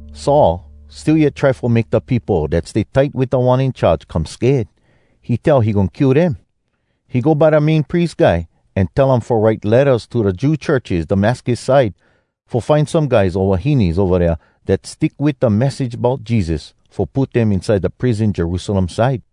Saul still yet try fo make da peopo dat stay tight wit Da One In Charge come sked. He tell he goin kill dem. He go by da Main Pries Guy an tell um fo write lettas to da Jew churches Damascus side, fo find some guys o wahines ova dea dat stick wit da message bout Jesus, fo put dem inside da prison Jerusalem side.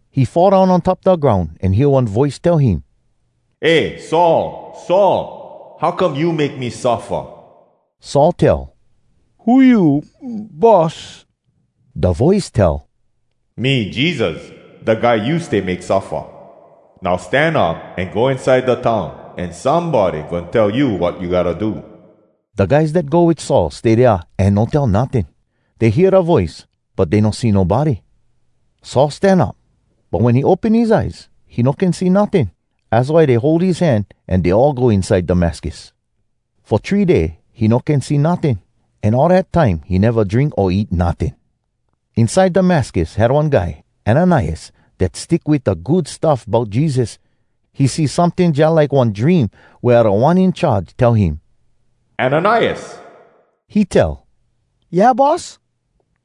He fall down on top da groun an hear one voice tell him, “Eh Saul! Saul! How come you make me suffa?” Saul tell, “Who you, Boss?” Da voice tell, “Me Jesus, da Guy you stay make suffa. Now stan up an go inside da town, an somebody goin tell you wat you gotta do.” Da guys dat go wit Saul stay dea an no tell notting. Dey hear da voice, but dey no see nobody. Saul stan up, but wen he open his eyes, he no can see notting. Az why dey hold his hand an dey all go inside Damascus. Fo three day he no can see notting. An all dat time he neva drink o eat notting. Inside Damascus had one guy, Ananias, dat stick wit da Good Stuff Bout Jesus. He see someting jalike one dream wea Da One In Charge tell him, “Ananias!” He tell, “Yeah, Boss?”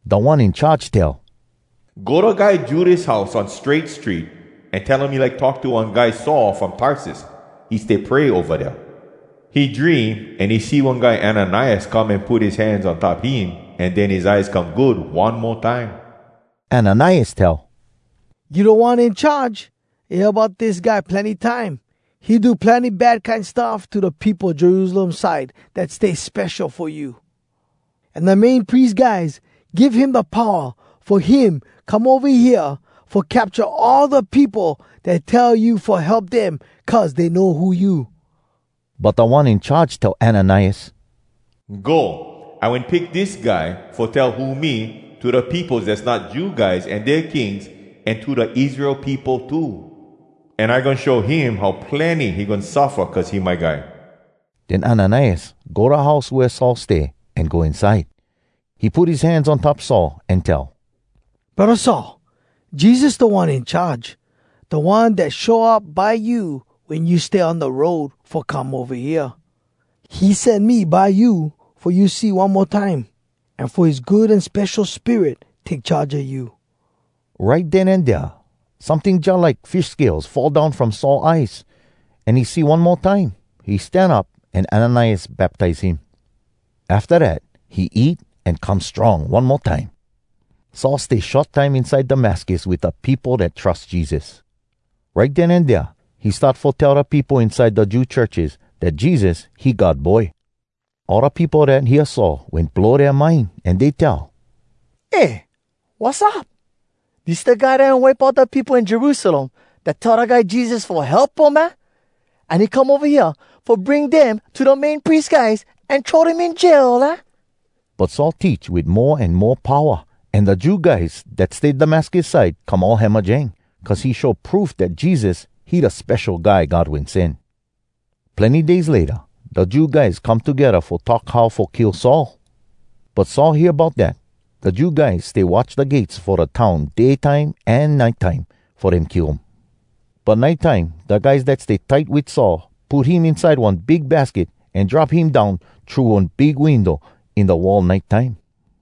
Da One In Charge tell, “Go da guy Judas house on Strait Street, an tell him you like talk to one guy Saul from Tarsus. He stay pray ova dea. He dream an he see one guy Ananias come an put his hands on top him an den his eyes come good one mo time.” Ananias tell, “You Da One In Charge! I hear bout dis guy plenny time. He do plenny bad kine stuff to da peopo Jerusalem side dat stay spesho fo you. An da Main Pries guys give him da powa fo him come ova hea fo capcha all da peopo dat tell you fo help dem cuz dey know who you.” But Da One In Charge tell Ananias, “Go! I wen pick dis guy fo tell who me to da peopos dass not Jew guys an dea kings an to da Israel peopo too. An I goin show him how plenny he goin suffa cuz he my guy.” Den Ananias go da house wea Saul stay an go inside. He put his hands on top Saul, an tell, “Braddah Saul, Jesus Da One In Charge, da One dat show up by you wen you stay on da road fo come ova hea. He sen me by you fo you see one mo time, an fo his Good An Spesho Spirit take charge a you.” Right den an dea someting jalike fish scales fall down from Saul eyes, an he see one mo time. He stan up an Ananias baptize him. Afta dat he eat, an come strong one mo time. Saul stay short time inside Damascus wit da peopo dat trus Jesus. Right den an dea he start fo tell da peopo inside da Jew churches dat Jesus, he God Boy. All da peopo dat hear Saul wen blow dea mind, an dey tell, “Eh, wassup? Dis da guy dat wen wipe out da peopo in Jerusalem dat tell da guy Jesus fo help um, aah? An he come ova hea fo bring dem to da Main Pries guys an throw dem in jail, aah?” But Saul teach wit mo an mo powa, an da Jew guys dat stay Damascus side come all hamajang, cuz he show proof dat Jesus, he da Spesho Guy God Wen Sen. Plenny days layta, da Jew guys come togedda fo talk how fo kill Saul. But Saul hear bout dat. Da Jew guys stay watch da gates fo da town day time an nite time, fo dem kill um. But nite time da guys dat stay tight wit Saul put him inside one big basket, an drop him down thru one big window in da wall nite time.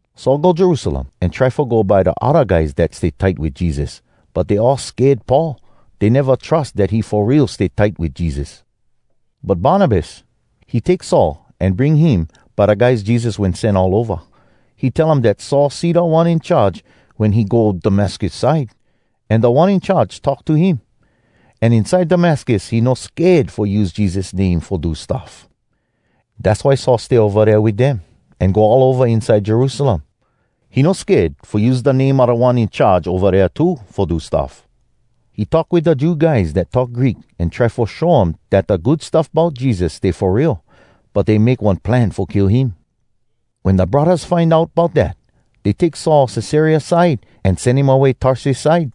Saul go Jerusalem, an try fo go by da odda guys dat stay tight wit Jesus, but dey all sked Paul. Dey neva trus dat he fo real stay tight wit Jesus. But Barnabas, he take Saul an bring him by da guys Jesus wen sen all ova. He tell um dat Saul see Da One In Charge wen he go Damascus side, an Da One In Charge talk to him. An inside Damascus he no sked fo use Jesus name fo do stuff. Dass why Saul stay ova dea wit dem, an go all ova inside Jerusalem. He no sked fo use da name a Da One In Charge ova dea too fo do stuff. He talk wit da Jew guys dat talk Greek, an try fo show um dat da Good Stuff Bout Jesus stay fo real. But dey make one plan fo kill him. Wen da braddahs find out bout dat, dey take Saul Cesarea side, an sen him away Tarsus side.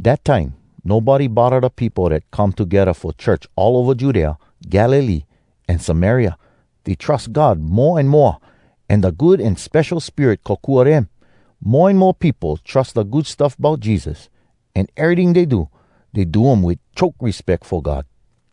Dat time nobody bodda da peopo dat come togedda fo church all ova Judea, Galilee, an Samaria. Dey trus God mo an moa, an da Good An Spesho Spirit kokua dem. Mo an mo peopo trus da Good Stuff Bout Jesus. An eryting dey do, dey do um wit choke respeck fo God.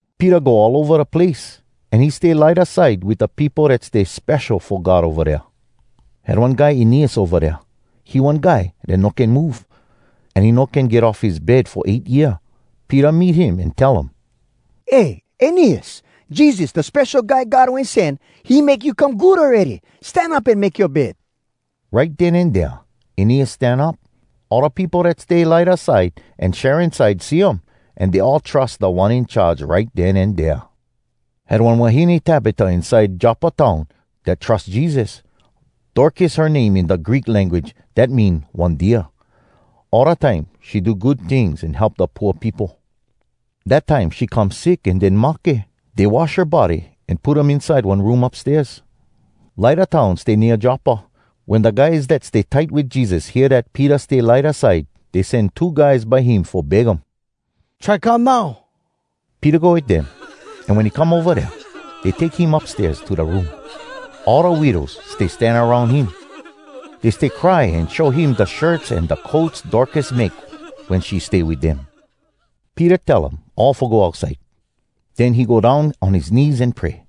Peter go all ova da place, an he stay Lydda side wit da peopo dat stay spesho fo God ova dea. Had one guy Eneas ova dea. He one guy dat no can move. An he no can get off his bed fo eight year. Peter meet him an tell um, “Eh, Eneas, Jesus, da Spesho Guy God Wen Sen, he make you come good awready. Stan up an make yoa bed.” Right den an dea Eneas stan up. All da peopo dat stay Lydda side an Sharon side see um, an dey all trus Da One In Charge right den an dea. Had one wahine Tabita inside Joppa town dat trus Jesus. (Dorcas her name in da Greek language. Dat mean “one deer.”) All da time she do good tings an help da pooa peopo. Dat time she come sick an den mahke. Dey wash her body an put um inside one room upstairs. Lydda town stay nea Joppa. Wen da guys dat stay tight wit Jesus hear dat Peter stay Lydda side, dey sen two guys by him fo beg um, “Try come now!” Peter go wit dem, an wen he come ova dea, dey take him upstairs to da room. All da widows stay stan aroun him. Dey stay cry an show him da shirts an da coats Dorcas make wen she stay wit dem. Peter tell um all fo go outside. Den he go down on his knees an pray.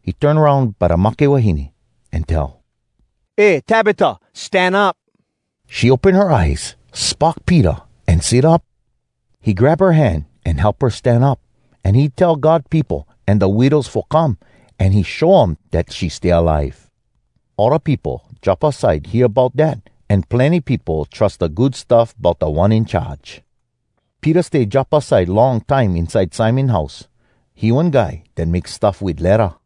He turn aroun by da mahke wahine, an tell, “Eh Tabita! Stan up!” She open her eyes, spock Peter, an sit up. He grab her hand an help her stan up. An he tell God peopo an da widows fo come, an he show um dat she stay alive. All da peopo Joppa side hear bout dat, an plenny peopo trus da Good Stuff bout Da One In Charge. Peter stay Joppa side long time inside Simon house. He one guy dat make stuff wit ledda.